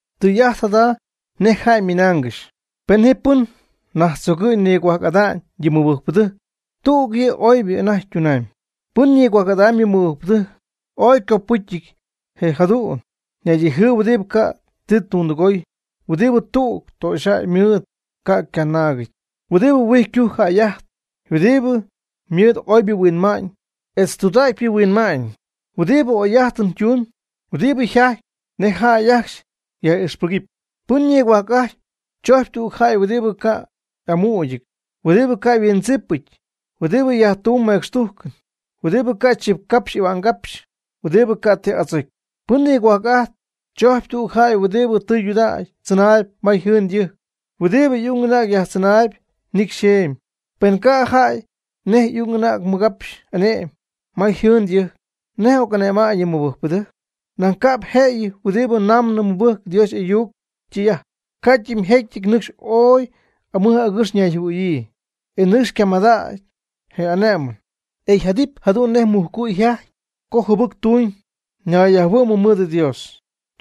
Tɨy'ajt jada nej jäy ymɨnaangɨxy. Pen ji pɨn najtzogɨ̈y nigohuajc'ada'ñ yɨ mɨbɨjcpɨdɨjc tüg yɨ' oybɨ anajty ytunamyb. Pɨn nigohuajc'ajtp yɨ mɨbɨjcpɨdɨjc ooy ycopɨcyɨty je' jadu'n naydijɨɨb huɨdibɨ ca' ti tundɨgoy, huɨdibɨ tüg töxyjäy mɨɨd ca'p ycanaagɨty, huɨdibɨ huijycujc jäy'ajtp, huɨdibɨ mɨɨd oybɨ yhuinma'ñ etz tudägypɨ yhuinma'ñ, huɨdibɨ oyjäy'ajtɨn tumb, huɨdibɨ jajtp nej jäy ajcxy yaj'ixpɨgɨpy. Pɨn nigohuajc'ajtp chojcpy tüg jäy huɨdibɨ ca' y'amügɨty, huɨdibɨ ca' yhuindzipɨty, huɨdibɨ yajtumb mecxtujcɨn, huɨdibɨ ca' chipcapxy y'ahua'ngapxy, huɨdibɨ ca' ti adzocy. Pɨn nigohuajc'ajtp chojcpy tüg jäy huɨdibɨ tɨydudägy tzɨnaayb ma yjɨɨn ytɨjc, huɨdibɨ y'ung y'anäg yajtzɨnaayb nicy yxeemy. Pen ca' jaty nej y'ung y'anäg mɨgapx ane'mɨp ma yjɨɨn ytɨjc, ¿nej oc'ane'ma'ñ yɨ mɨbɨjcpɨdɨjc? Nañ ca'p yjëjɨty huɨdibɨ namnɨ mɨbɨcy Dios y'ayuc ytɨy'ajt. Ycadɨmjecyɨty nɨcxy ooy amɨj agɨx ñayjɨhuɨ̈yii, e nɨcxy camadägy je ane'mɨn, e yjadɨpy jadu'n nej Satanás yjajty co jɨbɨc tumb ñayyajhuɨ'mɨ mɨɨd Dios.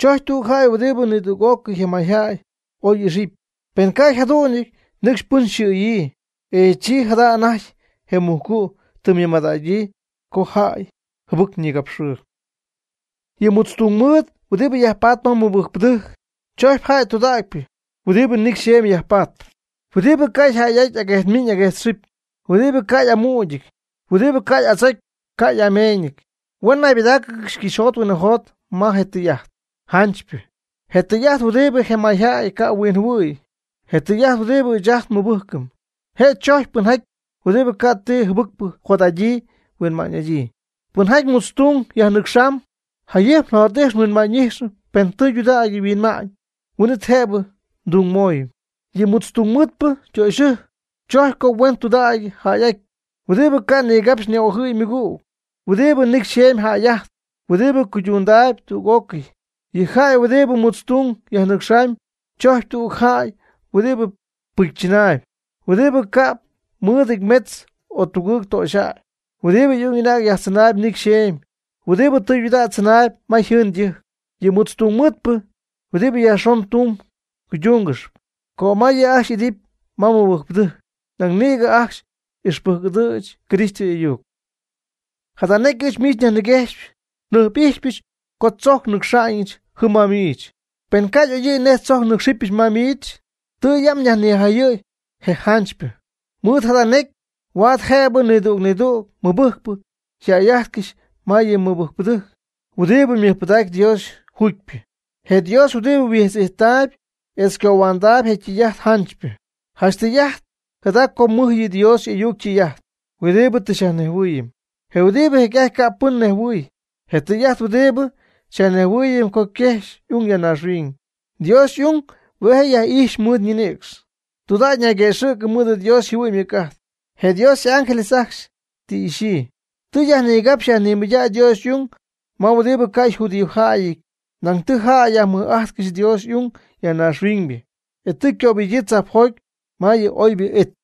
Chojcpy tüg jäy huɨdibɨ nidüg'ócɨy je mayjäy oy ijxɨp. Pen ca' yjadu'nɨty nɨcxy pɨn yxɨ̈yii, e chi jada anajty je mujcu' tɨ ymɨmadägyii co jäy jɨbɨc ñigapxɨɨyb. Yɨ mutz tungmɨɨd huɨdibɨ yajpat ma mɨbɨjcpɨdɨjc chojcpy jäy tudägypɨ, huɨdibɨ nicy xeemy jäy'ajtp, huɨdibɨ ca' jäy'aty aguejtmiñ aguejtxɨpy, huɨdibɨ ca' y'amügɨty, huɨdibɨ ca' y'adzocy ca' y'ameeñɨty. Huen naybɨdáacɨgɨxy cɨxyjot huinɨjot ma je tɨy'ajt janchypɨ. Je tɨy'ajt huɨdibɨ je mayjäy ca' huinjɨhuɨ̈y. Je tɨy'ajt huɨdibɨ ɨɨch ajt nmɨbɨjcɨm. Je' chojcpy pɨnjaty huɨdibɨ ca' ti jɨbɨcpɨ jot'adyii huinma'ñ'adyii. Pɨnjaty mutztung yajnɨcxamb, jayɨjp jot'ix huinma'ñ'ix pen tudägy yhuinma'ñ. Huin'it jëbɨ mdungmöy. Yɨ mutz tungmɨɨdpɨ ytöxyɨjc chojcpy co huen tudägy jäy'aty, huɨdibɨ ca' ñigapx ñi'ojɨ̈y ymɨgüg, huɨdibɨ nicy xeemy jäy'ajtp, huɨdibɨ cuydundaayb tüg'ócɨy. Yɨ jäy huɨdibɨ mutztung yajnɨcxamb chojcpy tüg jäy huɨdibɨ pɨcy chɨnaayb, huɨdibɨ ca'p mɨɨdɨty metz o tugɨɨg töxyjäy, huɨdibɨ y'ung y'anäg yajtzɨnaayb nicy xeemy, huɨdibɨ tɨydudägy tzɨnaayb ma yjɨɨn ytɨjc. Yɨ mutz tungmɨɨdpɨ huɨdibɨ yajxon ytung cuydungɨxy, cömay yɨ' ajcxy idɨpy ma mɨbɨjcpɨdɨjc. Nañ nïgɨ ajcxy ixpɨjc'ɨdɨ̈ch Cristo y'ayuc. Jada necy ɨɨch miich nyajniguejxyp. Njɨjp'ijxypɨch co tzojc nnɨcxa'ñɨch jɨm ma miich. Pen ca' y'oyɨ̈y nej tzojc nnɨ́cxɨbɨch ma miich, tɨ yam nyajnijayɨ̈y je janchypɨ. Mɨɨd jada necy huaad jëbɨ nidüg nidüg mɨbɨjcpɨ yjäy'ájtɨgɨxy ma yɨ mɨbɨjcpɨdɨjc huɨdibɨ mɨjpɨdacp Dios juugypɨ, je Dios huɨdibɨ huijtz'ijttaayb etz cohuandaayb je tɨy'ajt janchypɨ. Janch tɨy'ajt jada co mɨj yɨ' yɨ Dios y'ayuc ytɨy'ajt huɨdibɨ tɨ xyajnejhuɨɨyɨm, je huɨdibɨ jecy'ajty ca' pɨn nejhuɨ̈y. Je tɨy'ajt huɨdibɨ xyajnejhuɨɨyɨm co quexy y'ung ya naaxhuiñ. Dios y'ung hue' je' yaj'ijxy mɨɨd ñinïcx. Tudägy nayguëxɨ̈cɨ mɨɨd Dios yjɨhuɨ'ñ ymɨc'ajt. Je Dios y'ángeles ajcxy tɨ ixyii. Tɨ yajnigapxy yajnimɨydägy Dios y'ung ma huɨdibɨ ca' yjudiojäyɨty nañ tɨ jäy yajmɨj'ajtcɨxy Dios y'ung ya naaxhuiñybɨ. E tɨ ycöbɨgyii tzajpjoty ma yɨ oybɨ it.